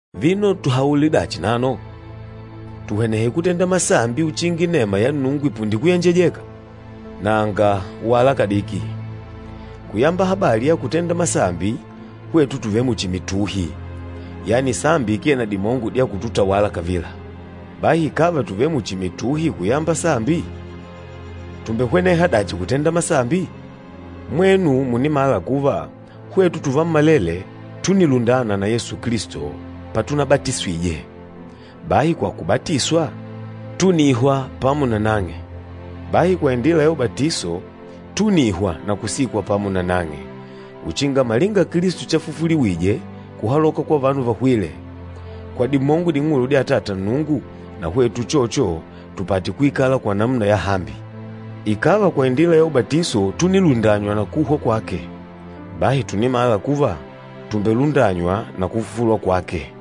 Vino tuhaule dachi nano? Tuhwenehe kutenda masambi uchinga inema ya Nnungu ipunde kuyenjejeka? Nanga, wala kadiki! Kuyamba habali ya kutenda masambi, hwetu tùvele muchi mituhi, yani sambi ikee na dimongo dya kututawala kavila. Bahi ikàva tùvele muchi mituhi kuyamba sambi, tùmbehweneha dachi kutenda masambi? Mwenu mùnimala kuva, hwetu tuvammalele túnilundana na Yesu Kilisto patunabatiswije, bahi kwa kubatiswa, túnihwa pamo na nang'e. Bahi kwa indila ya ubatiso, túnihwa na kusikwa pamo na nang'e, uchinga malinga Kilisto chafufuliwije kuhaloka kwa vanu vahwîle kwa dimongo ding'ulu dya Atata Nnungu, na hwetu uchocho tupate kuikala kwa namuna yahambi. Ikàva kwa indila ya ubatiso túnilundanywa na kuhwa kwake, bahi tùnimala kuva, tùmbelundanywa na kufufulwa kwake.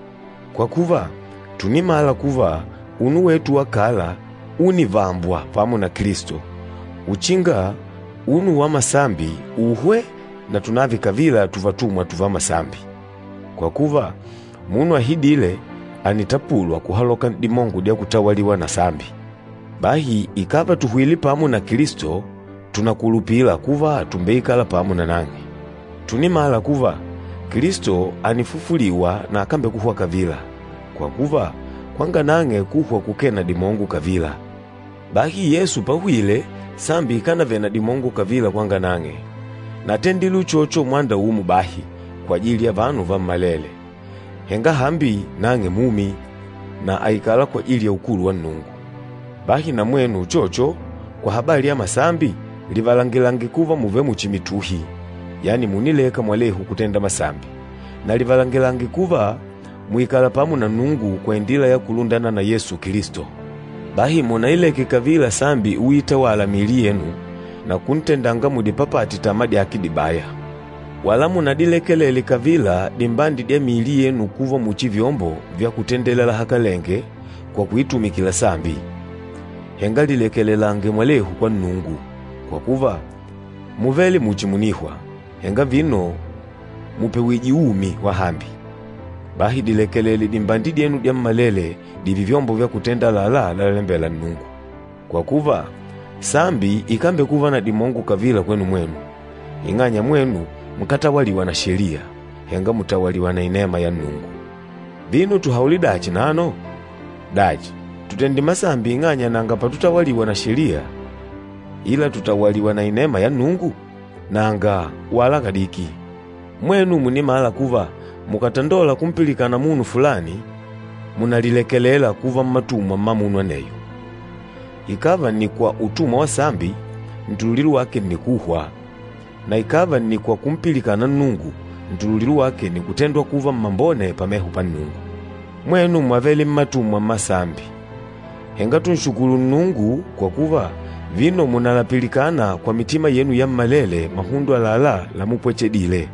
Kwa kuva, tùnimala kuva unu wetu wa kala únivambwa pamo na Kilisto, uchinga unu wa masambi uhwe na tunave kavila tuvatumwa tuva masambi. Kwa kuva, munu ahidîle ànitapulwa kuhaloka n'dimongo dya kutawaliwa na sambi. Bahi ikàva tùhwile pamo na Kilisto, tùnakulupila kuva tùmbeikala pamo nanang'e. Tùnimala kuva, Kilisto ànifufuliwa na akambekuhwa kavila, kwa kuva kwanga nang'e kuhwa kukee na dimongo kavila. Bahi Yesu páhwìlè, sambi ikànavele na dimongo kavila kwanga nang'e, na átendile uchocho mwanda umo bahi kwajili ya vanu vammalele, henga hambi nang'e mumi, na àikala kwajili ya ukulu wa Nnungu. Bahi na mwenu uchocho, kwa habali ya masambi, livalangilange kuva mùvele muchi mituhi, yani mùnileka mwalehu kutenda masambi, na livalangilange kuva mùikala pamo na Nnungu kwa indila ya kulundana na Yesu Kilisto. Bahi munaileke kavila sambi uitawala mmiili yenu na kuntendanga mudipapate tama dyake dibaya. Wala munadilekelele kavila dimbandi dya miili yenu kuva muchi vyombo vya kutendela lahakalenge kwa kuitumikila sambi. Henga lilekelelange mwalehu kwa Nnungu, kwa kuva múvele muchi mùnihwa, henga vino mùpewijwe umi wahambi. Bahi dilekelele dimbandi dyenu dyammalele dììve vyombo vya kutenda àlalá lalalembela Nnungu. Kwa kuva, sambi ikámbekuva na dimongo kavila kwenu mwenu, ing'anya mwenu nkátawaliwa na Sheliya, henga mùtawaliwa na inema ya Nnungu. Vino tuhaule dachi nano? Dachi, tutende masambi ing'anya nanga patutawaliwa na Sheliya, ila tùtawaliwa na inema ya Nnungu? Nanga, wala kadiki! Mwenu mùnimala kuva mukàtandola kumpilikana munu fulani, mùnalilekelela kuva mmatumwa mma munu aneyo. Ikàva nni kwa utumwa wa sambi, ntululilo wake nni kuhwa, na ikàva nni kwa kumpilikana Nnungu, ntululilo wake nni kutendwa kuva mmambone pameho pa Nnungu. Mwenu mwávele mmatumwa mma sambi. Henga tùnshukulu Nnungu, kwa kuva vino mùnalapilikana kwa mitima yenu yammalele mahundo àlalá lamupwechedile.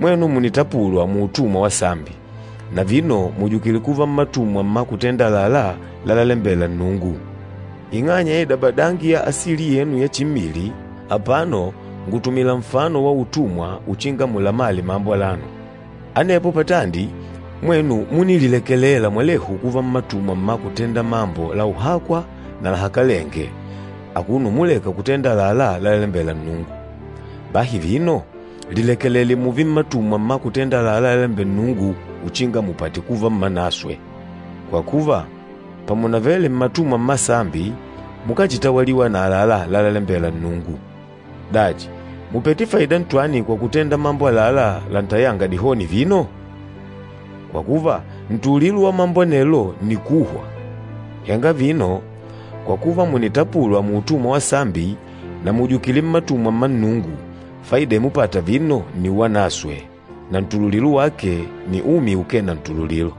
Mwenu mùnitapulwa muutumwa wa sambi, na vino mùjukile kuva mmatumwa mma kutenda àlalá lalalembela Nnungu. Ing'anya ya idabadangi ya asili yenu ya chimmili, apano ngùtumila nfano wa utumwa uchinga mulamale mambo alano. Anepo patandi, mwenu múnililekelela mwalehu kuva mmatumwa mma kutenda mambo la uhakwa na lahakalenge akuno umuleka kutenda àlalá lalalembela Nnungu. Bahi vino, lilekelele mùùve mmatumwa mma kutenda àlalá lalalembela Nnungu uchinga mupate kuva mmanaswe. Kwa kuva, pamunavele mmatumwa mma sambi, mukáchitawaliwa na àlalá lalalembela Nnungu. Dachi, mùpete faida ntwani kwa kutenda mambo àlalá lantayânga dihoni vino? Kwa kuva, ntululilo wa mambo anelo nni kuhwa! Henga vino, kwa kuva mùnitapulwa muutumwa wa sambi na mùjukile mmatumwa mma Nnungu, faida imupata vino nni uwanaswe, na ntululilo wake nni umi ukee na ntululilo.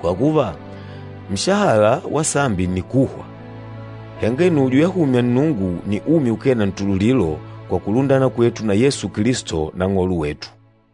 Kwa kuva, nshahala wa sambi nni kuhwa, henga inujo yahumya Nnungu nni umi ukee na ntululilo kwa kulundana kwetu na Yesu Kilisto, Nang'olo wetu.